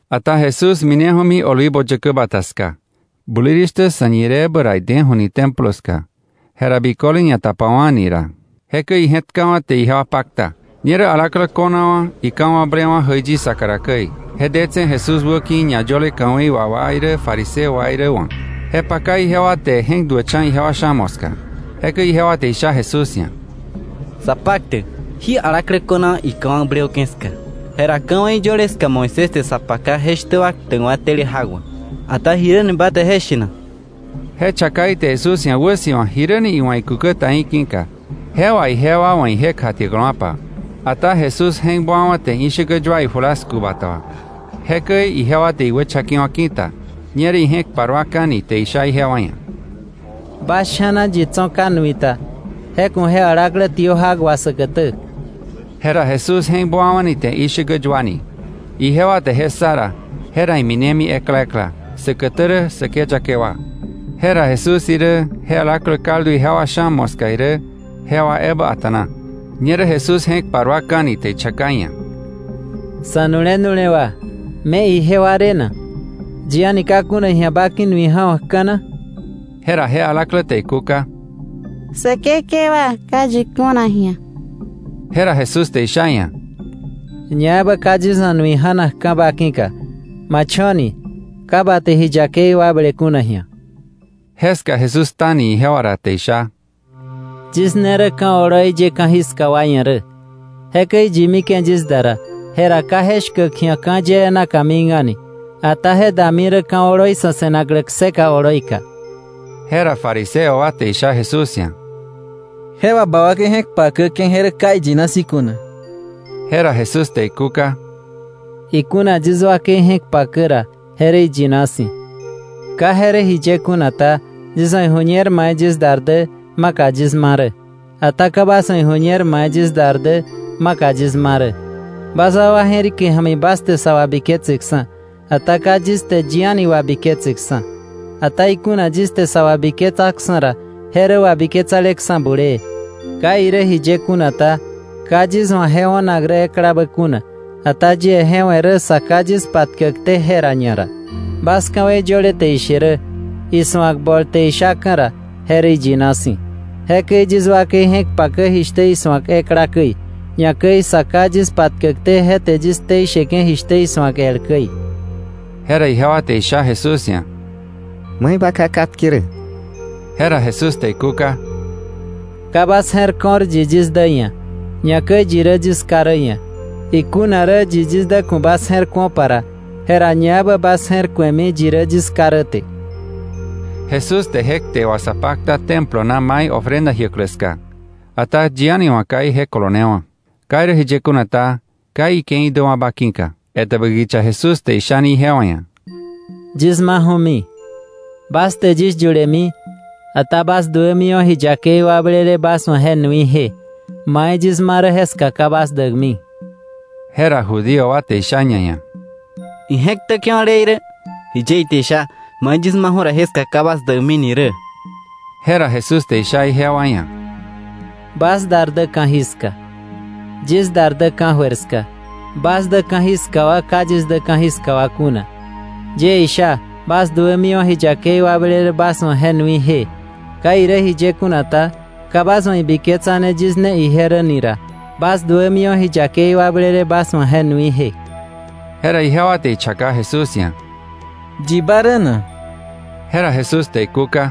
Ata Jesús mineju̱mi Olivo Yäkä Bata ska. Bulirishtä sa̱ñireebä ra ideju̱ni Templo ska. Jera biköle ñatapawa̱ni ira. Jekäi ije̱tkawa̱ te ijewa pakta. Ñerä alaklä ko̱nawa̱ ika̱wakblewa̱ jäiyi saka ra käi, je detse̱ Jesús wäki̱ ñayöle ka̱wei wà wa irä fariseo wa irä wa̱. Je paka ijewa te je̱k duäkcha̱ ijewa sha̱ moska. Jekäi ijewa te isha Jesús ia̱: —Sapaktäk, jí alaklä ko̱nawa̱ ika̱wakblewa̱ke̱ ska. Jera ka̱wei yöle ska Moisés te sa paka je shtä wa ktäkwa̱ tele jak wà. Ata ¿jiräni ba te je she na? Je chaka ite Jesús ia̱ wäsi̱wa jiräni iwa̱ ikúkä ta í̱ ki̱ka, jewa ijewa wa̱ ije kjatiäkläwa̱pa. Ata Jesús je̱k buawa̱ te ishäkä yua ijulasku bata wà. Jekäi ijewa te iwächakewa̱ ki̱ta. Ñerä ije̱k paruaka̱ni te isha ijewa ia̱: —Bas sha̱na yi tso̱ ka nui ta, je ku̱ je alaklä tiö jak wà säkätä. Jera Jesús je̱k buawa̱ni te ishäkä yuani. Ijewa te je ssa ra, jera iminemi ekla ekla, säkätä rä säkeyake wa. Jera Jesús irä, je alaklä kaldu ijewa sha̱ moska irä, jewa ebä a̱ta̱na. Ñerä Jesús je̱k paruaka̱ni te ichaka iia̱: —Sa̱nu̱le nu̱lewa, ¿me ijewa re na? ¿Yi a̱ni ka kuna ji̱a ba ki̱ nui ja̱wa̱kka̱ na? Jera je alaklä te ikúka: —Säkekewa, ka yi kuna ji̱a. Jera Jesús te isha iia̱: —Ñaebä ka yis wa̱ nui ja̱nakka̱ ba ki̱ka. Ma cho̱ni, ka bä te ji yakei wakble kuna ji̱a. Jeska Jesús ktani ijewa ra te isha: —Yis ne rä ka̱ oloi ye ka̱jiska wa ia̱ rä. Jekäi yi mike̱ yis da ra, jera ka je shkäk ji̱a ka̱ yee naka mik a̱ni. Ata je dami rä ka̱ oloi sa̱ se̱naklä kseka oloika. Jera fariseo wa te isha Jesús ia̱: —Je wà ba wakei je̱k pakäke̱, je rä ka iyina si̱ kuna. Jera Jesús te ikúka: —Ikuna yis wakei je̱k pakä ra, je rä iyina si̱. ¿Ka je rä jiye kuna ta? Yis wa̱ iju̱ñer mai yis dar dä, maka yis ma rä. Ata ka bas wa̱ iju̱ñer mai yis dar dä, maka yis ma rä. Bas wakwa je̱rike ja̱mi bas te sä wabiketseksa̱, ata ka yis te yi a̱ni wabiketseksa̱. Ata ikuna yis te sa wabiketsaksa̱ ra, je rä wabiketsaleksa̱ bulee. Ka irä jiye kuna ta, ka yis wa̱ je o̱nak rä eklabä kuna, ata yie je we̱ rä Sa Ká yis patkäkté jera ñara. Bas ka̱wei yöle te ishe rä, isu̱ak bol te ishaka̱ ra, je rä iyina si̱. Jekäi yis wakei je̱k pakä jishtä isu̱ak ekla käi, ñakäi Sa Ká yis patkäkté je te yis ktei sheke̱ jishtä isu̱ak el käi. Jera ijewa te isha Jesús ia̱: —¿Mai ba ká katke rä? Jera Jesús te ikúka: —Ka bas je̱r ko̱r yi yis dä ia̱, ñakäi yi rä yis Ká rä ia̱. Ikuna rä yi yis dä ku̱ bas je̱r ku̱opa ra, jera ñaebä bas je̱r ku̱emi yi rä yis ká rä te. Jesús te je kte wà sa pakta Templo na mai ofrenda jiäklä ska, ata yi a̱ni wa̱ ka ije kolonewa̱. Ka irä jiye kuna ta, ka ike̱i däwa̱ba ki̱ka. Etäbä kicha Jesús te ishani ijewa ia̱: —Yis maju̱mi; bas te yis yulemi, ata bas duämiwa̱ ji yakei wakblele bas wa̱ je nuije. Mai yis ma rä jeska ka bas däkmi. Jera Judío wa te isha ñaia̱: —¿Ije̱k ktäke̱wa̱ le irä? ¿Jiye ite isha: ‘Mai yis maju̱ jeska ka bas däkmi’ ni rä? Jera Jesús te isha ijewa ia̱: —Bas dar dä ka̱jiska; yis dar dä ka̱jöir ska. Bas dä ka̱jiska wa; ka yis dä ka̱jiska wa kuna. Yie isha, bas duämiwa̱ ji yakei wakblele bas wa̱ je nuije. Ka irä jiye kuna ta, ka bas wa̱ ibiketsane yis ne ije rä ra, bas duämiwa̱ ji yakei wakblele bas wa̱ je nuije. Jera ijewa te ichaka Jesús ia̱: —¿Yi ba rä na? Jera Jesús te ikúka: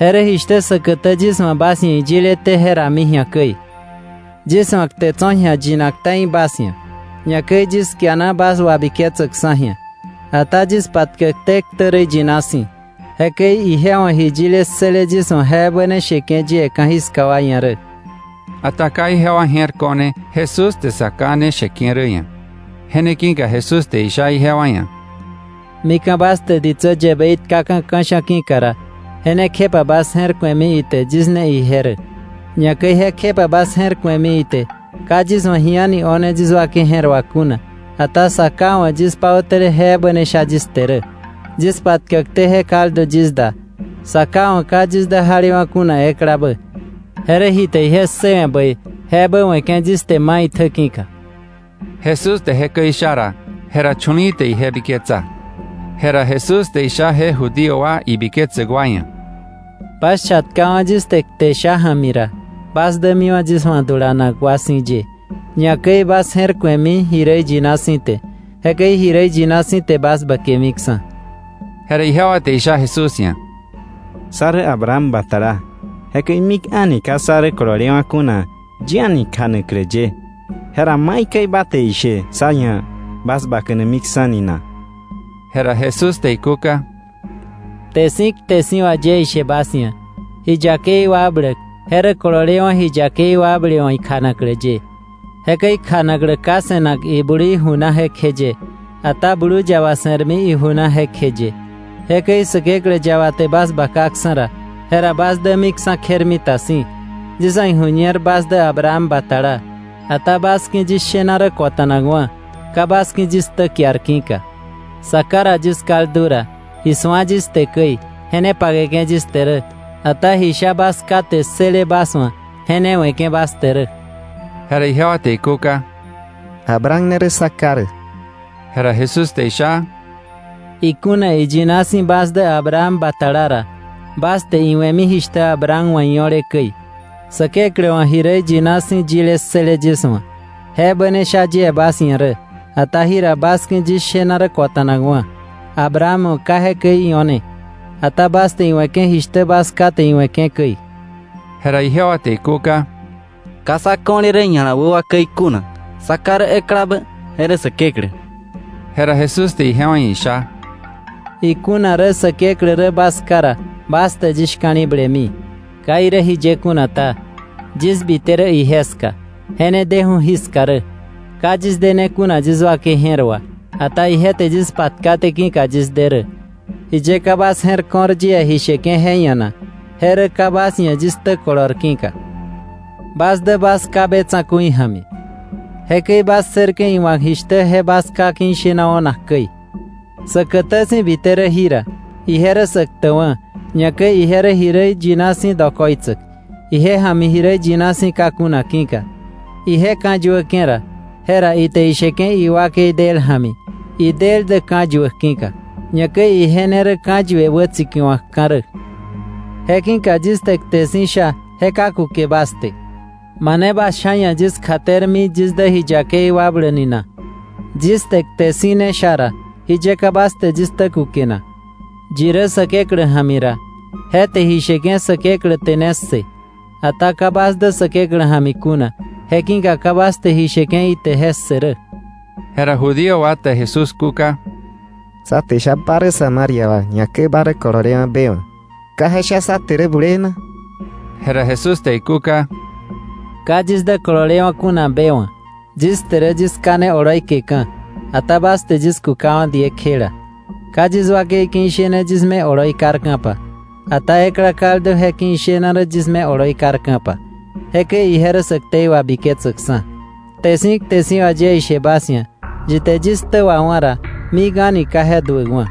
—Je rä jishtä säkätä yis wa̱ bas ia̱ iyileté je rami ji̱a käi. Yis wa̱ kte tso̱ ji̱a yinak ta̱i bas ia̱, ñakäi yis kiana bas wabiketsäkksa̱ ji̱a. Ata yis patkäkté ktä rä iyina si̱. Jekäi ije wa̱ ji yile ssële yis wa̱ je ebä sheke̱ yie ka̱jiska wa ia̱. Ata ka ijewa je̱r ko̱ne Jesús te Sa Ká ne sheke̱ rä ia̱. Je ne ki̱ka Jesús te isha ijewa ia̱: —Mika̱ bas te ditsä yäbei tkaka̱ ka̱sha̱ ki̱ka ra, je ne kjepa bas je̱r ku̱emi ite yis ne ije rä. Ñakäi jekjepa bas je̱r ku̱emi ite ka yis wa̱ ji a̱ni o̱ne yis wakei je̱r wà kuna, ata Sa Ká wa̱ yis pautäle je ebä sha yis te rä. Yis patkäkté je kaldu yis da. Sa Ká wa̱ ka yis dä jalewa̱ kuna eklabä, je rä ji te ije ssëwe̱ bäi je ebä we̱ke̱ yis te maitjä ki̱ka. Jesús te jekäi isha ra, jera chu̱li̱i̱ te ije biketsa. Jera Jesús te isha je Judío wa ibiketsäk wa ia̱: —Bas chatkawa̱ yis te kte sha ja̱mi ra, bas dämiwa̱ yis wa̱ dulanak wa si̱ ye, ñakäi bas je̱r ku̱emi ji rä iyina si̱ te. Jekäi ji rä iyina si̱ te bas bäkemiksa̱. Jera ijewa te isha Jesús ia̱: —Sá rä Abraham batala. Jekäi mik a̱ni ka sá rä kololewa̱ kuna yi a̱ni kjanaklä ye. Jera ¿maikäi ba te ishe sá ia̱ bas bakanamiksa̱ ni na? Jera Jesús te ikúka: —Kte si̱ kte si̱ wà yie ishe bas ia̱, ji yakei wakbläk je rä kololewa̱ ji yakei wakble wa̱ ikjanaklä ye. Jekäi kjanaklä ka se̱nak iblui ju na jekjeye, ata blu yaba se̱rmi iju na jekjeye. Jekäi Säkeklä yaba te bas bakaksa̱ ra, jera bas dämiksa̱ kjermita si̱. Yis wa̱ iju̱ñer bas dä Abraham batala. Ata bas ki̱ yis shena rä kota̱nakwa̱, ka bas ki̱ yis ktä kiar ki̱ka. Sa Ká ra yis kaldu ra, ji su̱a yis te käi, je ne pakeke̱ yis te rä. Ata ji sha bas ká te ssële bas wa̱, je ne we̱ke̱ bas te rä. Jera ijewa te ikúka: —Abraham ne rä sá ká rä. Jera Jesús te isha: —Ikuna iyina si̱ bas dä Abraham batala ra, bas te iwe̱mi jishtä Abraham wa̱ io̱le käi. Säkeklä wa̱ ji rä iyina si̱ yile ssële yis wa̱, je ebä ne sha yie bas ia̱ rä, ata jira bas ki̱ yis shena rä kota̱nakwa̱. Abraham wa̱ ka jekäi io̱ne. Ata bas te iwe̱ke̱ jishtä bas ká te iwe̱ke̱ käi. Jera ijewa te ikúka: —Ka sá ko̱le rä ña̱la wä wa käi kuna. Sá ká rä eklabä, je rä Säkeklä. Jera Jesús te ijewa ia̱ isha: —Ikuna rä Säkeklä rä bas ká ra, bas te yis shka̱li̱blemi. Ka irä jiye kuna ta, yis bite rä ije ska, je ne deju̱ jiska rä. Ka yis dene kuna yis wakei je̱r wà, ata ije te yis patkaté ki̱ka yis de rä. ¿Jiye ka bas je̱r ko̱r yie ji sheke̱ je ia̱ na? Je rä ka bas ia̱ yis ktä kolor ki̱ka. Bas dä bas ká be tsa̱ku̱i ja̱mi. Jekäi bas ssërke̱ iwa̱k jishtä je bas ká ki̱ ishena o̱nak käi. Säkätä si̱ bite rä jira, ije rä sä ktäkwa̱, ñakäi ije rä ji rä iyina si̱ dokoitsäk, ije ja̱mi ji rä iyina si̱ ka kuna ki̱ka. Ije ka̱yuäke̱ ra, jera ite isheke̱ iwakei del ja̱mi, idel dä ka̱yuäk ki̱ka, ñakäi ije ne rä ka̱yue wätsikiwa̱kka̱ rä. Je ki̱ka yis te kte si̱ sha, je ka kuke bas te. ¿Mane bas sha̱ ia̱ yis kjatermi yis dä ji yakei wakbläk ni na? Yis te kte si̱ ne sha ra, ¿jiye ka bas te yis ktä kuke na? Yi rä Säkeklä ja̱mi ra, je te ji sheke̱ Säkeklä te ne ssë. Ata ka bas dä Säkeklä ja̱mi kuna, je ki̱ka ka bas te ji sheke̱ ite je ssë rä. Jera Judío wa te Jesús kúka: —Sá te isha ba rä Samaria wa, ñakäi ba rä kololewa̱ be wa̱, ¿ka je sha sá te rä bulee na? Jera Jesús te ikúka: —Ka yis dä kololewa̱ kuna be wa̱. Yis te rä yis ká ne oloi keka̱. Ata bas te yis kukawa̱ diekjela. Ka yis wakei ki̱ ishene yis me oloi karka̱pa. Ata ekla kaldu je ki̱ ishena rä yis me oloi karka̱pa. Jekäi ije rä sä ktei wabiketsäkksa̱. Kte si̱ kte si̱ wà yie ishe bas ia̱, yi te yis ktä wawá̱ ra, mik a̱ni ka je duäkwa̱.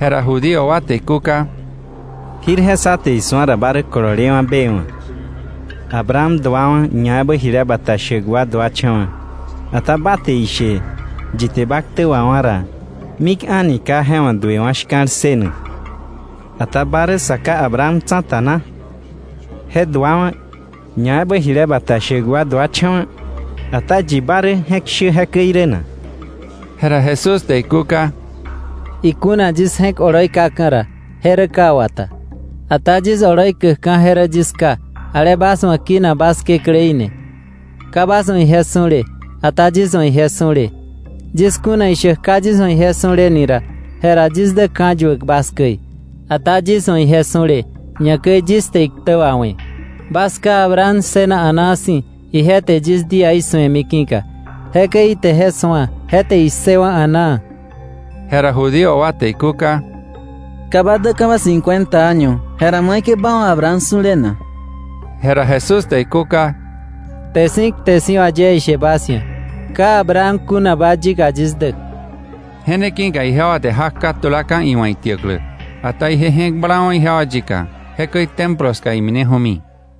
Jera Judío wa te ikúka: —Jirje sa te isu̱a ra ba rä kololewa̱ be wa̱. Abraham duawa̱, ñaebä jile bata shäk wa duacha̱wa̱, ata ba te ishe yi te ba ktä wawá̱ ra, mik a̱ni ka je wa̱ duewa̱ shka̱l ssënak. ¿Ata ba rä sa ká Abraham tsa̱ta na? Je duawa̱, ñaebä jile bata shäk wa duacha̱wa̱. Ata ¿yi ba rä je je̱k shä jekäi rä na? Jera Jesús te ikúka: —Ikuna yis je̱k oloi kaka̱ ra, je rä ka wata. Ata yis oloi käkka̱ je rä yis Ká, ale bas wa̱ kinak bas Kekläí ni. Ka bas wa̱ ije su̱le, ata yis wa̱ ije su̱le. Yis kuna ishäk ka yis wa̱ ije su̱le ni ra, jera yis dä ka̱yuäk bas käi. Ata yis wa̱ ije su̱le, ñakäi yis te iktä wawe̱. Bas ká Abraham ssëna a̱naa si̱, ije te yis díaí su̱emi ki̱ka. Jekäi ite je su̱a; je te issëwa̱ a̱naa. Jera Judío wa te ikúka: —Ka ba däka̱ba cincuenta año, jera ¿maikäi ba wa̱ Abraham su̱le na? Jera Jesús te ikúka: —Kte si̱ kte si̱ wà yie ishe bas ia̱, ka Abraham kunaba yika, yis dä. Je ne ki̱ka ijewa te jak katulaka̱ iwa̱ itiäklä. Ata ije je̱k blawa̱ ijewa yika. Jekäi Templo ska imineju̱mi.